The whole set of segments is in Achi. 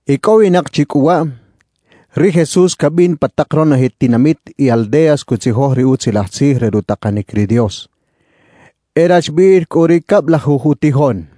Icꞌowinak chi cꞌu waꞌ, ri Jesús cabin pa tak ronoje tinamit y aldeas cutzijoj ri Utzilaj Tzij re rutakanic ri Dios. E rachbiꞌil cꞌu ri cablajuj utijoꞌn,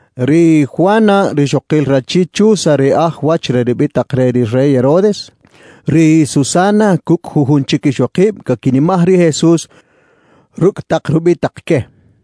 ri Juana rixokil rachi Chuza ri aj wach re rubitak re ri Rey Herodes, ri Susana cucꞌ jujun chic ixokib caquinimaj ri Jesús rucꞌ tak rubitak que.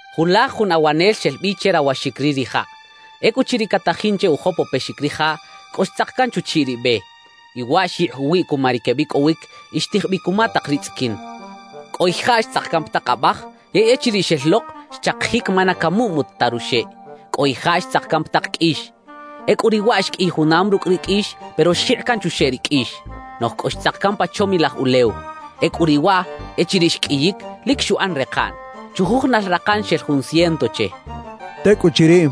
«Julaj jun awanel xel bi che rawaxic ri rijaꞌ. Ecꞌuchiriꞌ catajin che ujopopexic rijaꞌ, cꞌo xtzak can chuchiꞌ ri be. Y waꞌ xyikꞌ uwiꞌ cuma ri quebicꞌowic y xtij bi cuma tak ri tzꞌiquin. »Cꞌo ijaꞌ xtzak can pa tak abaj; yey echiriꞌ xel lok, xchakijic ma na camuꞌmut ta ruxeꞌ. »Cꞌo ijaꞌ xtzak can pa tak qꞌuix. Ecꞌu riꞌ waꞌ xqꞌuiy junam rucꞌ ri qꞌuix, pero xjikꞌ can chuxeꞌ ri qꞌuix. »Noꞌj cꞌo xtzak can pa chomilaj ulew. Ecꞌu riꞌ waꞌ, echiriꞌ xqꞌuiyic, lic xuꞌan rekaꞌn; chujujunal rakan xel jun ciento che» xchaꞌ. Tecꞌuchiriꞌ,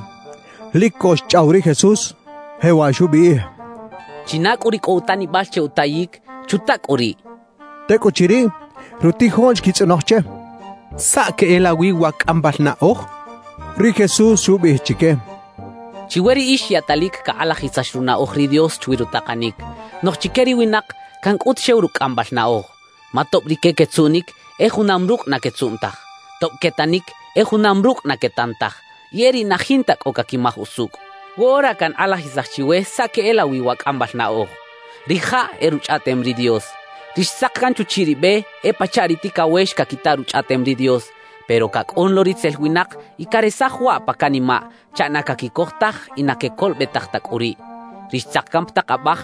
lic co xchꞌaw ri Jesús, jewaꞌ xubiꞌij: «China cꞌu ri cꞌo utanibal che utayic, ¡chuta cꞌu riꞌ!» xchaꞌ. Tecꞌuchiriꞌ, rutijoꞌn xquitzꞌonoj che: —¿Saꞌ queꞌelawi wa cꞌambal naꞌoj? —xechaꞌ. Ri Jesús xubiꞌij chique: «Chiwe riꞌix yaꞌtalic cakꞌalajisax runaꞌoj ri Dios chwi rutakanic. Noꞌj chique ri winak, cancꞌut xew rucꞌ cꞌambal naꞌoj. Ma tob rique quetzuꞌnic, e junam rucꞌ na quetzuꞌn taj; tob quetanic, e junam rucꞌ na quetan taj y e riꞌ na jinta cꞌo caquimaj usucꞌ. »Woꞌora cankꞌalajisaj chiwe saꞌ queꞌelawi wa cꞌambal naꞌoj. Rijaꞌ e Ruchꞌaꞌtem ri Dios. »Ri xtzak can chuchiꞌ ri be, e pachaꞌ ri ticawex caquita Ruchꞌaꞌtem ri Dios, pero cacꞌun lo ritzel winak y caresaj waꞌ pa canimaꞌ chaꞌ na caquicoj taj y na quecolobetaj ta cꞌu riꞌ. »Ri xtzak can pa tak abaj,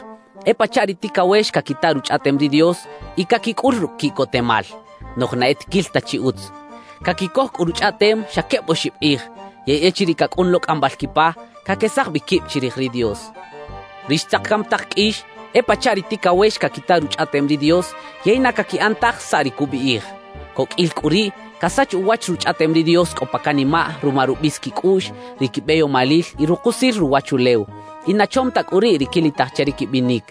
e pachaꞌ ri ticawex caquita Ruchꞌaꞌtem ri Dios y caquicꞌul rucꞌ quiꞌcotemal; noꞌj na e tiquil ta chi utz. Caquicoj cꞌu Ruchꞌaꞌtem xa queb oxib kꞌij; yey echiriꞌ cacꞌun lo cꞌambal quipa, caquesaj bi quib chirij ri Dios. »Ri xtzak can pa tak qꞌuix, e pachaꞌ ri ticawex caquita Ruchꞌaꞌtem ri Dios, yey na caquiꞌan taj saꞌ ri cubiꞌij. Coqꞌuil cꞌu riꞌ casach uwach Ruchꞌaꞌtem ri Dios cꞌo pa canimaꞌ ruma rubis quicꞌuꞌx, ri quibeyomalil y rukusil ruwachulew; y na chom ta cꞌu riꞌ ri quilitaj che ri quibinic.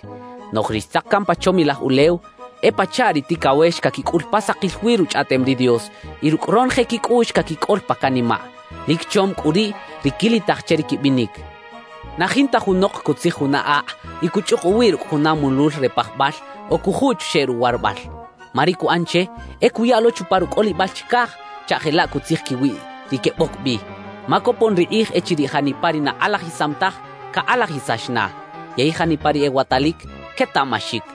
»Noꞌj ri xtzak can pa chomilaj ulew, e pachaꞌ ri ticawex caquicꞌul pa sakil wi Ruchꞌaꞌtem ri Dios y rucꞌ ronoje quicꞌuꞌx caquicꞌol pa canimaꞌ. Lic chom cꞌu riꞌ ri quilitaj che ri quibinic. »Na jinta junok cutzij juna akꞌ y cuchꞌuk uwiꞌ rucꞌ juna mulul re pajbal o cujuꞌ chuxeꞌ ruwarabal. Ma ri cuꞌan che, e cuya lo chupa rucꞌolibal chicaj chaꞌ jelaꞌ cutzij quiwiꞌ ri queboc bi. Ma copon ri kꞌij echiriꞌ janipa ri na kꞌalajisam taj, cakꞌalajisax na; yey janipa ri ewatalic, quetaꞌmaxic.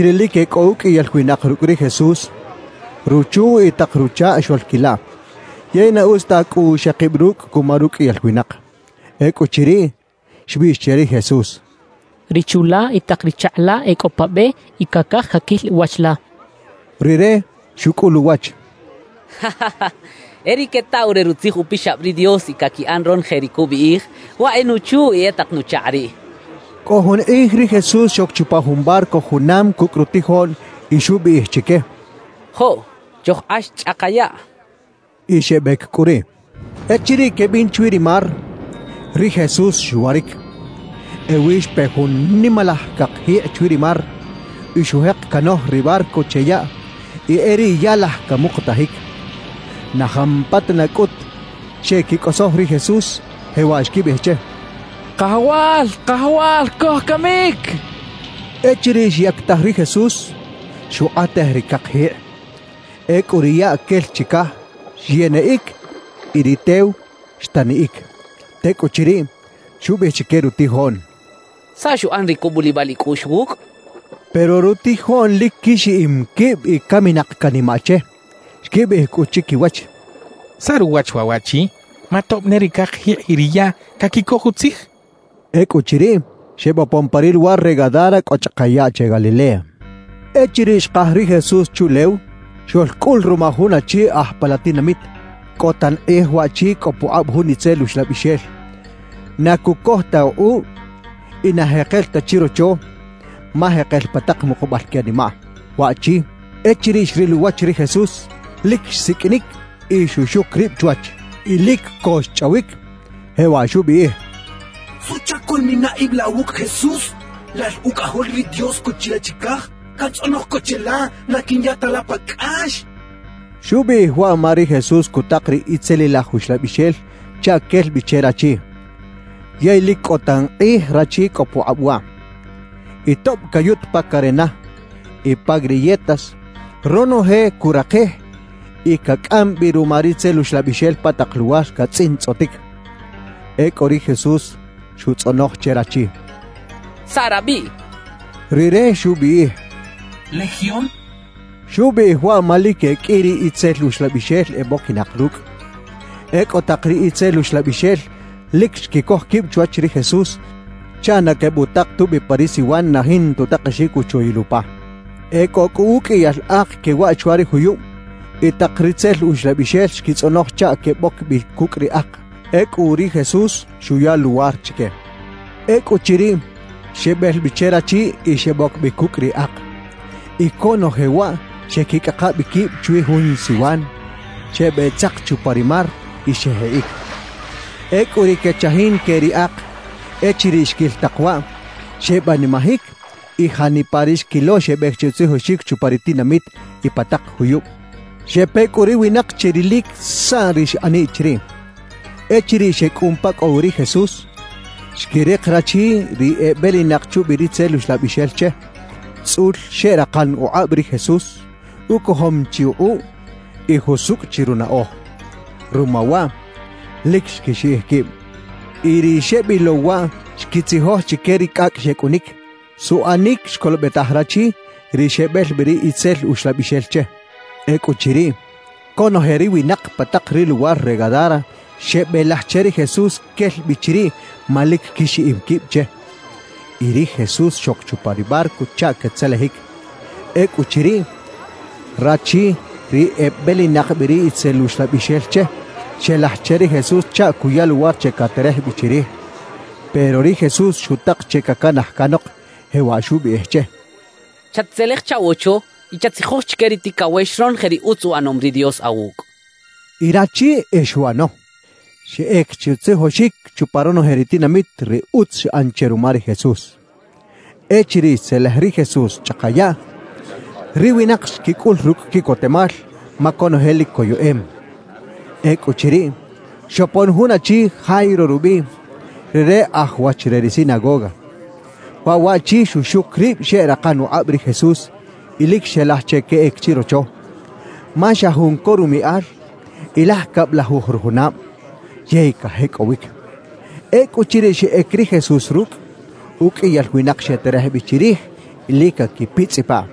Julaj echiriꞌ lic e cꞌo uqꞌuiyal winak rucꞌ ri Jesús, ruchu y tak ruchakꞌ xoꞌlquilaꞌ, yey na utz ta cꞌu xekib rucꞌ cuma ruqꞌuiyal winak. Ecꞌuchiriꞌ, xbiꞌx che ri Jesús: —Ri chu la y tak ri chakꞌ la e cꞌo pa be y cacaj caquil wach la. Rire xucꞌul uwach: —E ri quetaw re Rutzij Upixab ri Dios y caquiꞌan ronoje ri cubiꞌij, waꞌ e nuchu y e tak nuchakꞌ riꞌ —xchaꞌ. Cꞌo jun kꞌij ri Jesús xoc chupa jun barco junam cucꞌ rutijoꞌn y xubiꞌij chique: —Joꞌ, chojkꞌax chꞌaka yaꞌ —xcha chique. Y xebec cꞌu riꞌ. Echiriꞌ quebin chwi ri mar, ri Jesús xwaric. Ewi xpe jun nimalaj cakjikꞌ chwi ri mar y xujek canoj ri barco che yaꞌ y e riꞌ ya laj camukutajic. Na jampatana cꞌut xeꞌquicꞌosoj ri Jesús, jewaꞌ xquibiꞌij che: —¡Kajawal, Kajawal! ¡Cojcamic! —xecha che. Echiriꞌ xyactaj ri Jesús, xukꞌatej ri cakjikꞌ. Ecꞌu ri yaꞌ quel chicaj, xyeniꞌic y ri tew xtaniꞌic. Tecꞌuchiriꞌ, xubiꞌij chique rutijoꞌn: —¿Saꞌ xuꞌan ri cubulibal icꞌuꞌx wucꞌ? —xcha chique. Pero rutijoꞌn lic quixiꞌim quib y caminak canimaꞌ che. Xquibiꞌij cꞌu chiquiwach: «¿Saꞌ ruwach waꞌ waꞌchi? ¡Ma tob ne ri cakjikꞌ y ri yaꞌ caquicoj utzij!» xechaꞌ. Ecꞌuchiriꞌ, xebopon pa ri luwar re Gadara cꞌo chꞌaka yaꞌ che Galilea. Echiriꞌ xkaj ri Jesús chuꞌlew, xoꞌlcꞌul ruma jun achi aj pa la tinamit. Cꞌo tan kꞌij waꞌchi cꞌo pukꞌab jun itzel uxlabixel. Na cucoj ta ukꞌuꞌ y na jekel ta chirocho, ma jekel pa tak mukubal que animaꞌ. Waꞌchi, echiriꞌ xril uwach ri Jesús, lic xsiqꞌuinic y xuxuc rib chwach. Y lic co xchꞌawic, jewaꞌ xubiꞌij: —¿Suꞌchac coꞌlmina ib la wucꞌ, Jesús, lal Ucꞌajol ri Dios cꞌo chilaꞌ chicaj? Cantzꞌonoj co cheꞌla na quinya ta la pa cꞌax —xchaꞌ. (Xubiꞌij waꞌ ma ri Jesús cutak ri itzelilaj uxlabixel chaꞌ quel bi che rachi. Yey lic cꞌo tan kꞌij rachi cꞌo pukꞌab waꞌ. Y tob cayut pa carena y pa griyetas, ronoje curakij y cacꞌam bi ruma ri itzel uxlabixel pa tak luwar catzꞌintzꞌotic.) Ecꞌu ri Jesús xutzꞌonoj che rachi: —¿Saꞌ rabiꞌ? —xchaꞌ. Rire xubiꞌij: —Legión —xchaꞌ. Xubiꞌij waꞌ ma lic e qꞌui ri itzel uxlabixel eboquinak rucꞌ. Ecꞌu tak ri itzel uxlabixel lic xquicoj quib chwach ri Jesús chaꞌ na quebutak tubi pa ri siwan na jinta utakexic uchoyil upa. E cꞌo cꞌu uqꞌuiyal ak quewaꞌ chwa ri juyub y tak ri itzel uxlabixel xquitzꞌonoj chaꞌ queboc bi cucꞌ ri ak. Ecꞌu ri Jesús xuya luwar chique. Ecꞌuchiriꞌ, xebel bi che rachi y xeboc bi cucꞌ ri ak. Y conoje waꞌ xeꞌquicꞌaka bi quib chwi jun siwan, xebeꞌtzak chupa ri mar y xejikꞌic. Ecꞌu ri quechajin que ri ak, echiriꞌ xquil tak waꞌ, xebanimajic y janipa ri xquilo xebec che utzijoxic chupa ri tinamit y pa tak juyub. Xepe cꞌu ri winak che rilic saꞌ ri xꞌaniꞌ chiriꞌ. Echiriꞌ xecꞌun pa cꞌo wi ri Jesús, xquirik rachi ri ebelinak chubi ri itzel uxlabixel che, tzꞌul xeꞌrakan ukꞌab ri Jesús, ucojom chi ukꞌuꞌ y jusucꞌ chi runaꞌoj. Ruma waꞌ, lic xquixiꞌij quib. Y ri xebilow waꞌ xquitzijoj chique ri cꞌacꞌ xecꞌunic, suꞌanic xcolobetaj rachi ri xebel bi ri itzel uxlabixel che. Ecꞌuchiriꞌ, conoje ri winak pa tak ri luwar re Gadara xebelaj che ri Jesús quel bi chiriꞌ ma lic quixiꞌim quib che. Y ri Jesús xoc chupa ri barco chaꞌ catzelejic. Ecꞌuchiriꞌ, rachi ri ebelinak bi ri itzel uxlabixel che, xelaj che ri Jesús chaꞌ cuya luwar che caterej bi chirij; pero ri Jesús xutak che cacanaj canok, jewaꞌ xubiꞌij che: —Chat-tzelej chaꞌwocho y chatzijoj chique ri ticawex ronoje ri utz uꞌanom ri Dios awucꞌ —xchaꞌ. Y rachi e xuꞌano; xeꞌec che utzijoxic chupa ronoje ri tinamit ri utz xꞌan che ruma ri Jesús. Echiriꞌ xtzelej ri Jesús chꞌaka yaꞌ, ri winak xquicꞌul rucꞌ quiꞌcotemal ma conoje lic coyeꞌem. Ecꞌuchiriꞌ, xopon jun achi Jairo rubiꞌ, rire aj wach re ri sinagoga. Waꞌ waꞌchi xuxuc rib xeꞌrakan ukꞌab ri Jesús y lic xelaj che queꞌec chirocho, ma xa jun co rumiꞌal y laj cablajuj rujunab, yey cajecꞌowic. Ecꞌuchiriꞌ xeꞌec ri Jesús rucꞌ, uqꞌuiyal winak xeterej bi chirij y lic caquipitzꞌipaꞌ.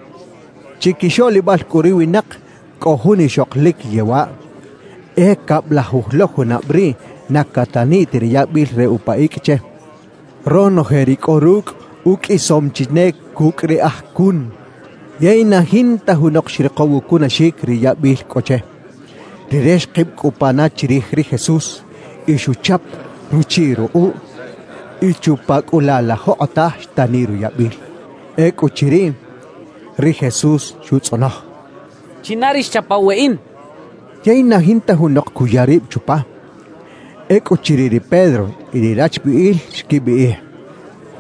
Chiquixoꞌlibal cꞌu ri winak cꞌo jun ixok lic yewaꞌ, e cablajuj lo junab riꞌ na cataniꞌ ta ri yabil re upa icꞌ che. Ronoje ri cꞌo rucꞌ uqꞌuisom chi ne cucꞌ ri aj cun, yey na jinta junok xrikow ucunaxic ri yabil cꞌo che. Rire xkib cꞌu pana chirij ri Jesús y xuchap ruchiꞌ rukꞌuꞌ. Y chupa cꞌu laꞌ la jokꞌotaj xtaniꞌ ruyabil. Ecꞌuchiriꞌ, ri Jesús xutzꞌonoj: —¿China ri xchapaw weꞌin? —xchaꞌ. Yey na jinta junok cuya rib chupa. Ecꞌuchiriꞌ ri Pedro y ri rachbiꞌil xquibiꞌij: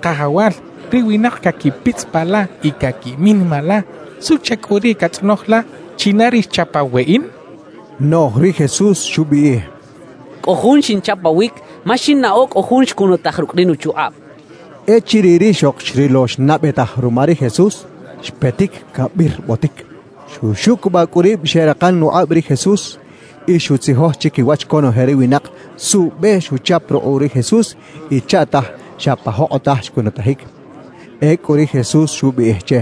—Kajawal, ri winak caquipitzꞌipaꞌ la y caquiminimaꞌ la. ¿Suꞌchac cꞌu riꞌ catzꞌonoj la: “¿China ri xchapaw weꞌin?” —xechaꞌ. Noꞌj ri Jesús xubiꞌij: —Cꞌo jun xinchapawic ma xinnaꞌo cꞌo jun xcunutaj rucꞌ ri nuchukꞌab —xchaꞌ. Echiriꞌ rixok xrilo xnaꞌbetaj ruma ri Jesús, xpetic cabirbotic. Xuxucubaꞌ cꞌu rib xeꞌrakan ukꞌab ri Jesús y xutzijoj chiquiwach conoje ri winak suꞌbe xuchap rukꞌuꞌ ri Jesús y chaꞌtaj xa pa jokꞌotaj xcunutajic. Ecꞌu ri Jesús xubiꞌij che: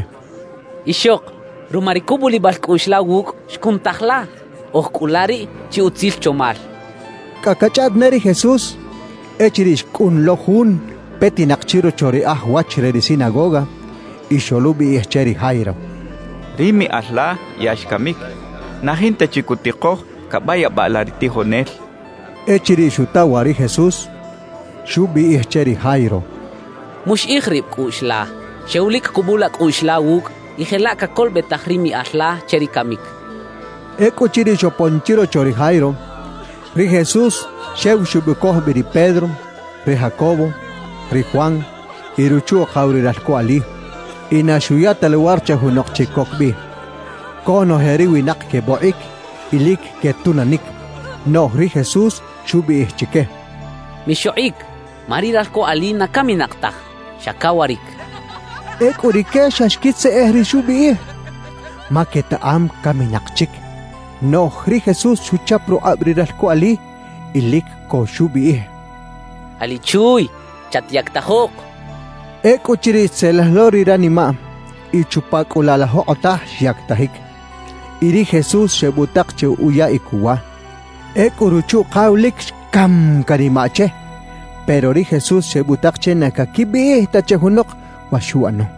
—Ixok, ruma ri cubulibal cꞌuꞌx la wucꞌ, xcunutaj la. Oj cꞌu la riꞌ chi utzil chomal —xchaꞌ. Cꞌa cachꞌaꞌt ne ri Jesús, echiriꞌ xcꞌun lo jun petinak chirocho ri aj wach re ri sinagoga y xoluꞌbiꞌij che ri Jairo: —Ri miꞌal la ya xcamic; na jinta chi cutikoj cabayabaꞌ la ri tijonel —xchaꞌ. Echiriꞌ xuta waꞌ ri Jesús, xubiꞌij che ri Jairo: —Muxiꞌij rib cꞌuꞌx la, xew lic cubula cꞌuꞌx la wucꞌ y jelaꞌ cacolobetaj ri miꞌal la che ri camic —xchaꞌ. Ecꞌuchiriꞌ xopon chirocho ri Jairo, ri Jesús xew xebucoj bi ri Pedro, ri Jacobo, ri Juan y ruchu-ukaw ri ralco ali; y na xuya ta luwar che junok chic coc bi. Conoje ri winak quebokꞌic y lic quetunanic. Noꞌj ri Jesús xubiꞌij chique: —Mixokꞌic, ma ri ralco ali na caminak taj, xa cawaric —xchaꞌ. Ecꞌu rique xa xquitzeꞌej ri xubiꞌij, ma quetaꞌam caminak chic. Noꞌj ri Jesús xuchap rukꞌab ri ralco ali y lic co xubiꞌij: —Ali chuuy, ¡chatyactajok! —xchaꞌ. Ecꞌuchiriꞌ xtzelej lo ri ranimaꞌ y chupa cꞌu laꞌ la jokꞌotaj xyactajic. Y ri Jesús xebutak che uyaꞌic uwa. Ecꞌu ruchu-ukaw lic xcam canimaꞌ che, pero ri Jesús xebutak che na caquibiꞌij ta che junok wa xuꞌano.